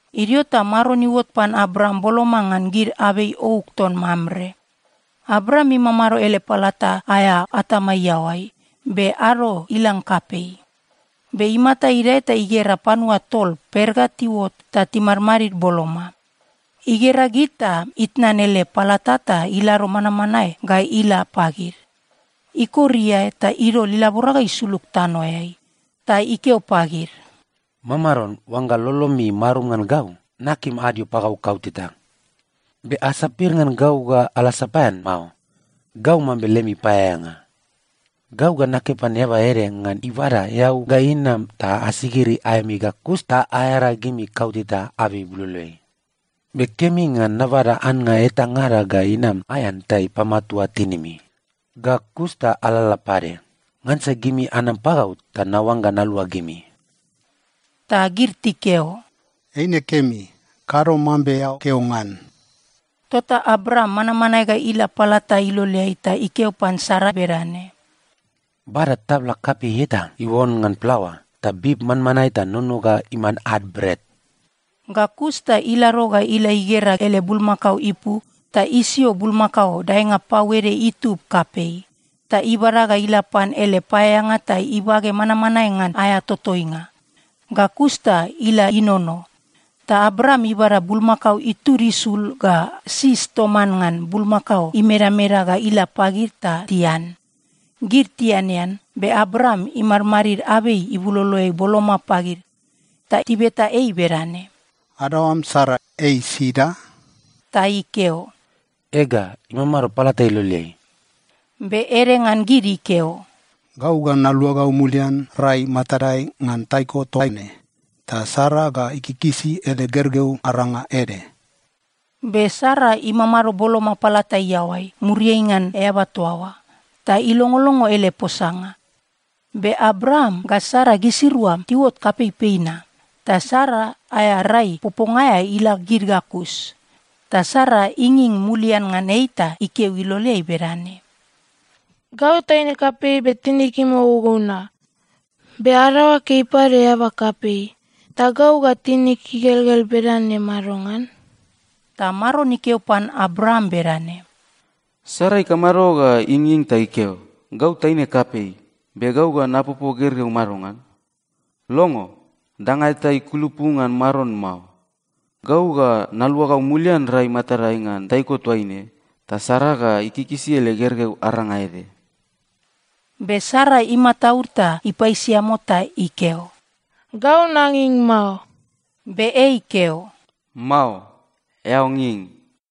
Idio ta Maron iuot pan Abraam boloma ngan gid abei ouk ton Mamre. Abraam imamado ele palata aea atama iaoai, be ado ilang kapei. Be imata idae ta igera panua tol per ga tiuot ta timadmadid boloma. Igera gid ta itnan ele palata ta ilado manmanae ga ila pagid. Ikor iae ta idol ilabora ga isulug tanoeai. Ta ikeo pagid, “Mamaron, oangga lolomi marum ngan gau, nakim adio pagau kauteta. Be asapir ngan gau ga ala sapaean mao. Gau mambe lemi paeaeanga. Gau ga nakeo pan eaba ede ngan ibada eau ga inam ta asigiri aemi ga kus ta aearagimi kauteta abei ibuloloeai. Be kemi ngan nabada annga etangada ga inam aean ta ipamatua tinimi. Ga kus ta alalala pade. Ngansa gimi anam pagau ta naoangga nalua gimi.” Ta gid tikeo, “Eine kemi, kado mambe eao keo ngan.” Tota Abraam manmanae ga ila palata iloleai ta ikeo pan Sara bedane, “Bada tabla kapei eta iuon ngan plaoa, ta bib manmanae ta nono ga iman ad bret.” Ga kus ta ilado ga ila igera ele bulmakao ipu ta isio bulmakao daenga pau ede itub kapei. Ta ibada ga ila pan ele paeaeanga ta ibage manmanae ngan aea totoinga, ga kus ta ila inono. Ta Abraam ibada bulmakao itud isul ga sis toman ngan bulmakao imedameda ga ila pagid ta tian. Gid tianean, be Abraam imadmadid abei ibuloloeai boloma pagid. Ta tibeta ei bedane, “Adaoam Sara, ei sida?” Ta ikeo, “Ega, imamado palata iloleai.” Be ede ngan gid ikeo, “Gau ga naluagau mulian rai matadai ngan taiko toaine, ta Sara ga ikikisi ele gergeu aranga ede.” Be Sara imamado boloma palata iaoai, muriai ngan eaba toa oa, ta ilongolongo ele posanga. Be Abraam ga Sara gisirua tiuot kapeipei na, ta Sara aea rai poponga aea ila gid ga kus. Ta Sara inging mulian ngan ei ta ikeo iloleai bedane, “Gau taine kapei be tinig imogougou na. Be adaoag ei pade eaba kapei. Ta gau ga tinig igelgel bedane madongan?” Ta Maron ikeo pan Abraam bedane, “Sara ikamado ga inging ta ikeo, ‘Gau taine kapei, be gau ga napopo gergeu madongan?’ Longo! Danga eta ikulupu ngan Maron mao. Gau ga naluagau mulian rai matadai ngan taiko toaine, ta Sara ga ikikisi ele gergeu aranga ede.” Be Sara imataud ta ipaisiamo ta ikeo, “Gau nanging mao.” Be ei ikeo, “Mao. Eao nging.”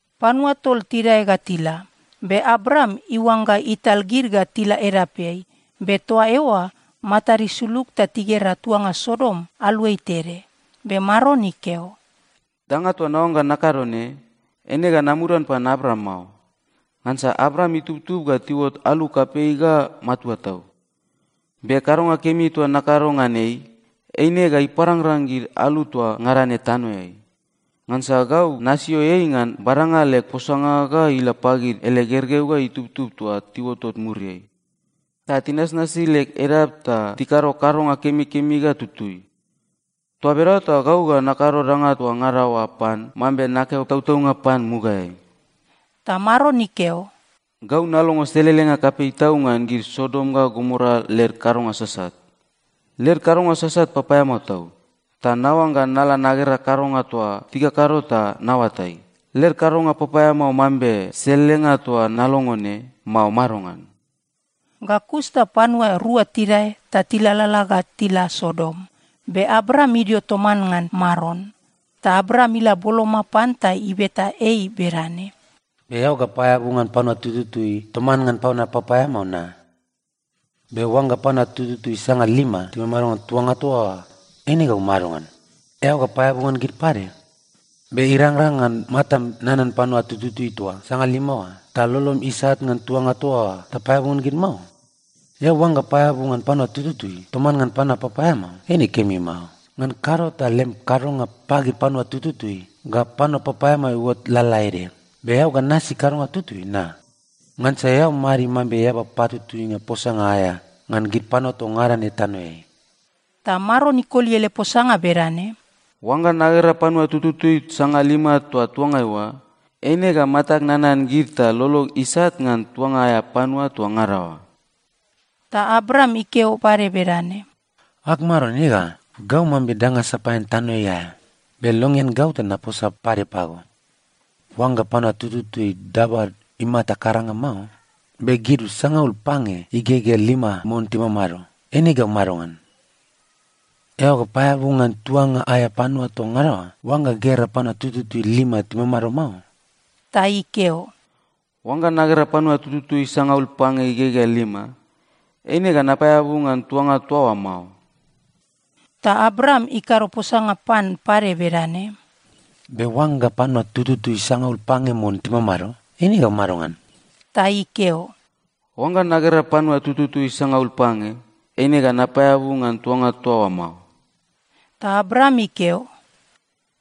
Panua tol tidae ga tila, be Abraam iuangga ital gid ga tila edapeai. Be toa eoa matad isulug ta tigera tuanga Sodom aluai tede. Be Maron ikeo, “Danga toa naoangga nakado ne, eine ga namudan pan Abraam mao. Ngansa Abraam itubtub ga tiuot alu kapei ga matua tau. Be kadonga kemi toa nakado ngan ei, eine ga iparangrang gid alu toa ngada ne tanoeai. Ngansa gau nasio ei ngan badanga leg posanga ga ila pagid ele gergeu ga itubtub toa tiuotot muriai, ta tinasnasi leg edap ta tikado kadonga kemikemi ga tutui. Toa bedaoa ta gau ga nakado danga toa ngada oa pan mambe nakeo tautaunga pan mugaeai.” Ta Maron ikeo, “Gau nalongo selelenga kapei tau ngan gid Sodom ga Gomora led kadonga sasat. Led kadonga sasat papaeamao tau, ta naoangga nala nagera kadonga toa tikakado ta naoatai, led kadonga papaeamao mambe selelenga toa nalongo ne, mao madongan?” Ga kus ta panua rua tidae ta tilalala ga tila Sodom, be Abraam idio toman ngan Maron. Ta Abraam ila boloma pan ta ibeta ei bedane, “Be eao ga paeabu ngan panua tututui toman ngan panua papaeamao na? Be oangga panua tututui sangalima timamado ngan tuanga toa oa, eine gau madongan? Eao ga paeabu ngan gid pade? Be irangrang ngan matam nanan gid panua tututui toa sangalima oa, ta lolom isat ngan tuanga toa oa ta paeabu ngan gid mao? Eao oangga paeabu ngan panua tututui toman ngan panua papaeamao, eine kemi mao. Ngan kado ta lem kadonga pagid panua tututui ga panua papaeamao iuot lalaede. Be eao ga nasi kadonga tutui, na? Ngansa eao madid mambe eaba patutuinga posanga aea ngan gid panua toa ngada ne tanoeai.” Ta Maron ikoli ele posanga bedane, “Oangga nagera panua tututui sangalima toa tuangai oa, eine ga matag nanan gid ta lolog isat ngan tuanga aea panua toa ngada oa.” Ta Abraam ikeo pade bedane, “Ag Maron, ega, gau mambe danga sapaean tanoeai aea, be longean gau ta naposa pade pago. Oangga panua tututui dabad imata karanga mao, be gid sangaul pange igegea lima mon timamado, eine gau madongan? Eao ga paeabu ngan tuanga aea panua toa ngada oa oangga gera panua tututui lima timamado mao?” Ta ikeo, “Oangga nagera panua tututui sangaul pange igegea lima, eine ga napaeabu ngan tuanga toa oa mao.” Ta Abraam ikado posanga pan pade bedane, “Be oangga panua tututui sangaul pange mon timamado, eine gau madongan?” Ta ikeo, “Oangga nagera panua tututui sangaul pange, eine ga napaeabu ngan tuanga toa oa mao.” Ta Abraam ikeo,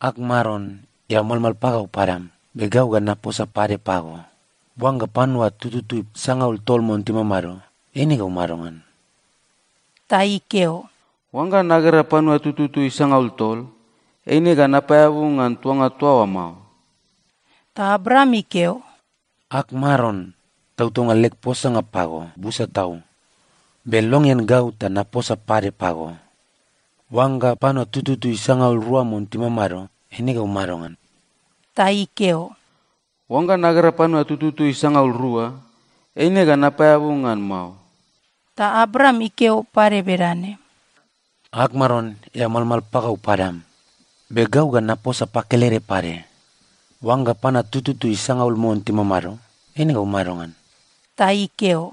“Ag Maron, eao malmal pagau padam. Be gau ga naposa pade pago. Oangga panua tututui sangaul tol mon timamado, eine gau madongan?” Ta ikeo, “Oangga nagera panua tututui sangaul tol, eine ga napaeabu ngan tuanga toa oa mao.” Ta Abraam ikeo, “Ag Maron, tautaunga leg posanga pago busa tau, be longean gau ta naposa pade pago. Oangga panua tututui sangaul rua mon timamado, eine gau madongan?” Ta ikeo, “Oangga nagera panua tututui sangaul rua, eine ga napaeabu ngan mao.” Ta Abraam ikeo pade bedane, “Ag Maron, eao malmal pagau padam, be gau ga naposa pakelede pade. Oangga panua tututui sangaul mon timamado, eine gau madongan?” Ta ikeo,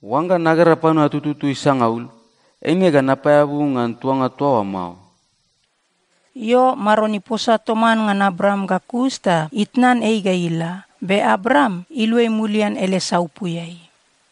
“Oangga nagera panua tututui sangaul, eine ga napaeabu ngan tuanga toa oa mao.” Io, Maron iposa toman ngan Abraam ga kus ta itnan ei ga ila, be Abraam iluai mulian ele saupuiai.